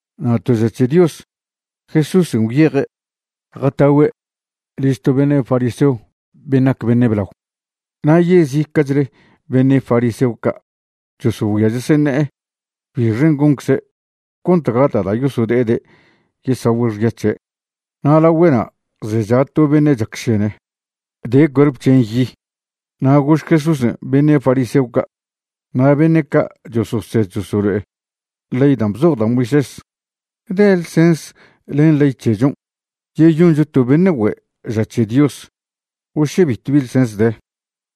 Na' to ža c̱he Dios Jesúsen' gwyeje' jatagüe' liž to beṉe' fariseo ben' nac beṉe' blao. Na' yezica'chle beṉe' fariseo ca' chosogüia cheseṉe'e bixen' goncze' cont gata' da' yosode'ede' yesagüe' xya c̱he'. Na' lagüe'na' zecha to beṉe' chacšene, de cuerp c̱hen' yi. Na' gož Jesúsen' beṉe' fariseo ca' na' beṉe' ca' chososed chosolo'e ley dan' bzoj da' Moisés: ―¿De ḻsens len ley c̱hechon' yeyoncho to beṉe' güe' ža c̱he Dios o še bitw bi ḻsens de?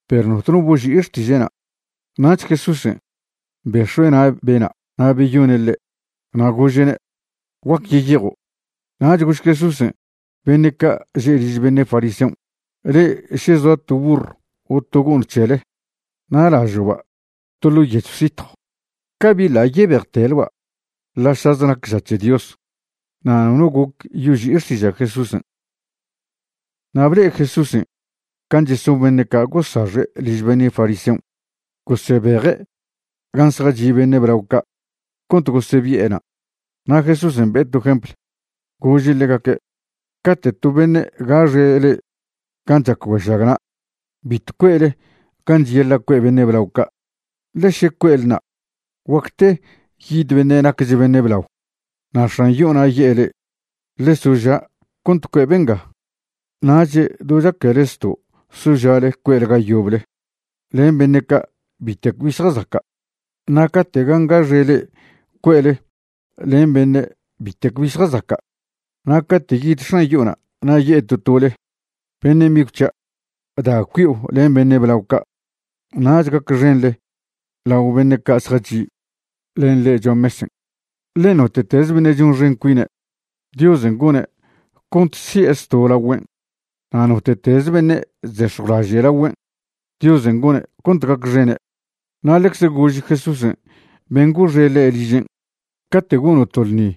Perw notno boži'i xtiže'na'. Nach Jesúsen' bex̱ue' na' bena' na' beyone' ḻe', na' gože'ne': ―Guac yeyejo'. Nach gož Jesúsen' beṉe' ca' že' liž beṉe' fariseon': ―Le'e še zoa to burr o to go'ṉ c̱hele na' lažo'ba' to ḻo' yechw sitjw, ¿cabi ḻa' yebejteleba' ḻa'šaze nac ža c̱he Dios? Na' nono goc yoži'i xtiža' Jesúsen'. Na' ble'e Jesúsen' can' cheson beṉe' ca' gosaxe' liž beṉe' fariseon', gosebeje' gan' zjachi' beṉe' blao ca' cont gosebi'ena'. Na' Jesúsen' be'e to jempl, gože' ḻegaque': ―Cate' to beṉe' gaxe' le'e gan' chac güešagna', bitw cue'le gan' cheyaḻa' cue' beṉe' blao ca', ḻe še cue'le na', guacte yid beṉe' nacch beṉe' blao na' x̱an yo'ona' ye'e le'e: “Ḻe soža' cont cue' benga.” Nach do chaquele zto' soža'le cue'le ga yoble len beṉe' ca' bitec bi zjazaca'. Na' cate' gan' gaxe' le'e cue'le len beṉe' bitec bi zjazaca', na' cate' yid x̱an yo'ona' na' ye'e to tole: “Beṉe' migw c̱hia', da cui'o len beṉe' blao ca'.” Nach gacxenḻe lao beṉe' ca' zjachi' len le'e cho'a mesen'. Ḻe note'teze beṉe' chonxen cuine', Diosen' gone' cont si'e zto' lagüen'. Na' note'teze beṉe' chzex̱jwlaže' lagüen', Diosen' gone' cont gacxene'. Na' ḻecze gož Jesúsen' ben' goxe' ḻe' ližen': ―Cate' gono' to ḻṉi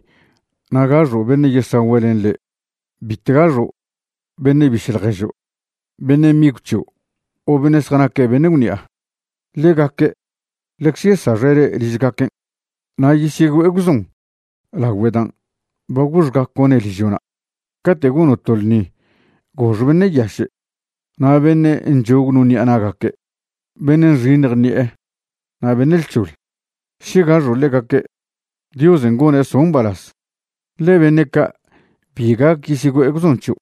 na' gaxo' beṉe' yesagüe' len le', bitw gaxo' beṉe' biše' ḻježo', beṉe' migw c̱hio' o beṉe' zjanaque' beṉe' gwṉi'a. Ḻegaque' ḻecze yesaxe' le' ližgaquen', na' yesyegüe'e gwzon lagüe dan' ba goxgaco'ne' ližo'na'. Cate' gono' to lṉi gox beṉe' yaše' na' beṉe' nchog no ṉi'a na'gaque', beṉe' nxiṉj ṉi'e, na' beṉe' lc̱hoḻ. Še gaxo' ḻegaque', Diosen' gone' so' mbalaz, ḻe beṉe' ca' bi gac yesyegüe'e gwzon c̱hio'.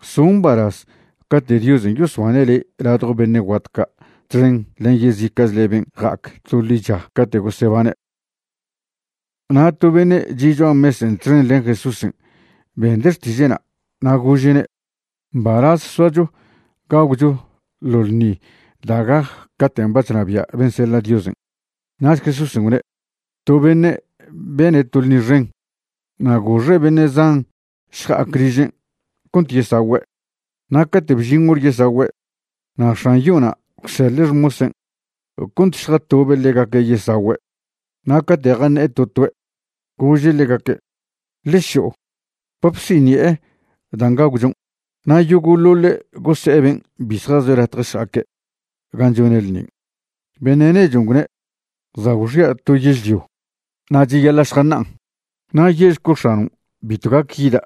So' mbalaz cate' Diosen' yosbane' le' ladjo beṉe' guat ca' txen len yezica'chle ben' ja'ac to ḻicha cate' gosebane'. Na' to beṉe' chi' cho'a mesen' txen len Jesúsen' bende' xtiže'na' na' gože'ne': ―Mbalaz soacho gagwcho ḻo ḻṉi da' gac caten' ba chnabia' ben' seḻa' Diosen'. Nach Jesúsen' gwne': ―To beṉe' bene' to ḻṉi xen, na' goxe' beṉe' zan šja'ac ližen' cont yesagüe'. Na' cate' bžin hor yesagüe', na' x̱an yo'ona' gwseḻe' xmosen' cont šjatobe' ḻegaque' yesagüe'. Na' cate' jaṉe'e to toe', gože' ḻegaque': “Ḻe šo'o, ba bsiṉi'e dan' gagwchon'.” Na' yogo'ḻoḻe' gose'e ben' bi zjazoe' latje šja'aque' gan' chone' ḻṉin'. Beṉe' nechon' gwne': “Za' gwxia' to yežlio, na' cheyaḻa' šjaṉa'an. Na' ye'šco' x̱anon' bitw gac yida'.”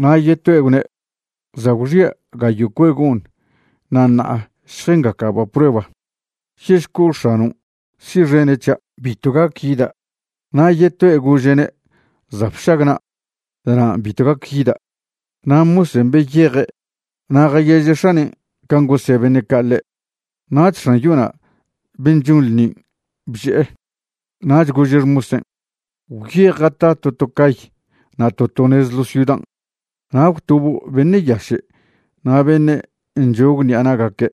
Na' yetoe' gwne': “Za' gwxia' gayo' cue' go'ṉ na' ṉa'a šjengaca'ba' prueba. Ye'šco' x̱anon' si'xene' c̱hia', bitw gac yida'.” Na' yetoe' gože'ne': “Za' bšagna'. Da'nan' bitw gac yida'.” Na' mosen' beyeje' na' jayeže' x̱anen' can' gose' beṉe' ca' ḻe'. Nach x̱an yo'ona' ben' chon ḻṉin' bže'e. Nach gože' xmosen': “Gwyej jata to to cay na' to to nez ḻo ciudan', na' gwtobo' beṉe' yaše' na' beṉe' nchog ṉi'a na'gaque'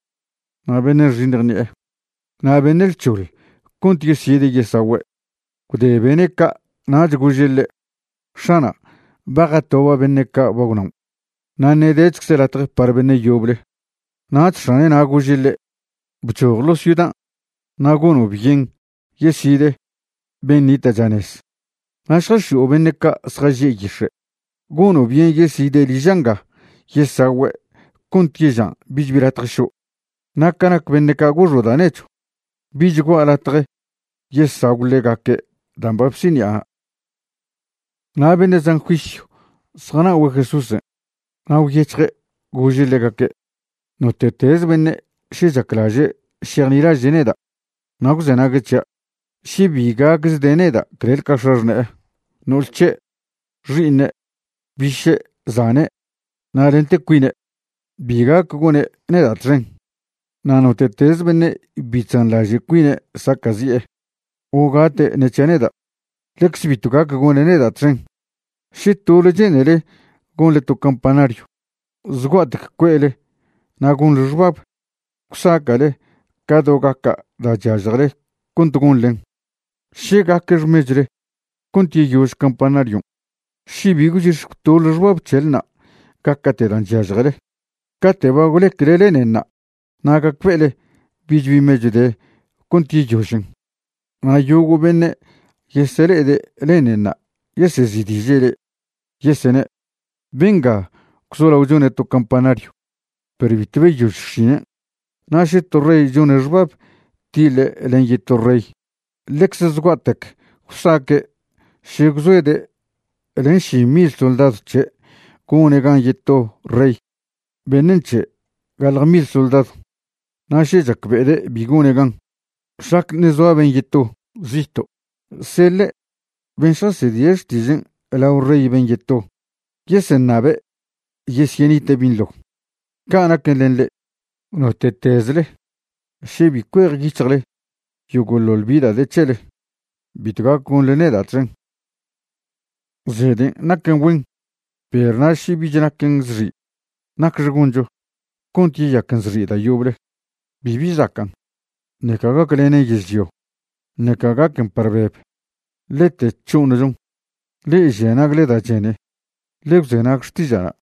na' beṉe' nxiṉj ṉi'e, na' beṉe' lc̱hoḻ cont yeside' yesagüe'.” Gwde bene' ca' nach gože' ḻe': “X̱ana', ba jatoba' beṉe' ca' ba gwnaon', na' ṉe' dechcze latje par beṉe' yoble.” Nach x̱ane'na' gože' ḻe': “Bchoj ḻo' ciudan' na' gono' byen yesid ben' nita' chanez. Na' šjax̱i'o beṉe' ca' zjaže' yix̱e'. Gono' byen yeside' liža' nga yesagüe' cont yežan' bich bi latje šo'. Na' ca nac beṉe' ca' goxa' da' nechw, bich gua' latje yesagw ḻegaque' dan' ba bsiṉi'ana'.” Na' beṉe' zan juisyw zjana'ogüe' Jesúsen', na' gwyec̱hje' gože' ḻegaque': ―Note'teze beṉe' še chaclaže' šejnilaže' neda' na' gwzenague' c̱hia', še bi gacchde' neda' clel ca x̱axṉe'e, no'ol c̱he', xi'iṉe', biše', zane', na' lente cuine', bi gac gone' neda' txen. Na' note'teze beṉe' bi chzanḻaže' cuine' saca'zi'e o gate' ṉe c̱hia' neda', ḻecze bitw gac gone' neda' txen. Še tole che'nele gonḻe to campanaryw, zgua'tec cue'le na' gonḻe xbab gwsaca'le ca do gaca' da' chyažjele cont gonḻen, še gaque xmechwle cont yeyož campanaryon'. Še bi gwchix̱ gwtoḻe xbab c̱helna' gaca'te' dan' chyažjele, cate' ba gwlecle lenenṉa' na' gacbe'ele bich bi mechw de cont yeyožen, na' yogo' beṉe' yesele'ede' lenenṉa' yesezi'diže' le'e, yesene': “Benga gwzolao chone' to campanaryw perw bitw beyož xšinen'.” Na' še to rey chone' xbab tiḻe' len yeto rey, ḻecze zgua'tec gwsaque' še gwzoede' len ši mil soldadw c̱he' gone' gan yeto rey beṉe' nc̱he' gaḻje mil soldadw. Na' še chacbe'ede' bi gone' gan, šlac ṉe' zoa ben' yeto, zito', seḻe' ben' šjasedie' xtižen' lao rey ben' yeto yeseṉabe' yesyenite' binḻo. Ca' naquen len le'e, note'tezle še bi cuejyic̱hjle yogo'ḻoḻ bi da' de c̱hele, bitw gac gonḻe neda' txen. ’Zeden' naquen güen, perw na' še bich naquen zxi', ¿nacxe goncho cont yeyaquen zxi' da' yoble? Bibi zacan', ṉeca gaclenen yežlio, ṉeca gaquen par beb, lete c̱ho'oṉchon. Le'e žia nagle da' chene, ḻe gwzenag xtiža'na'.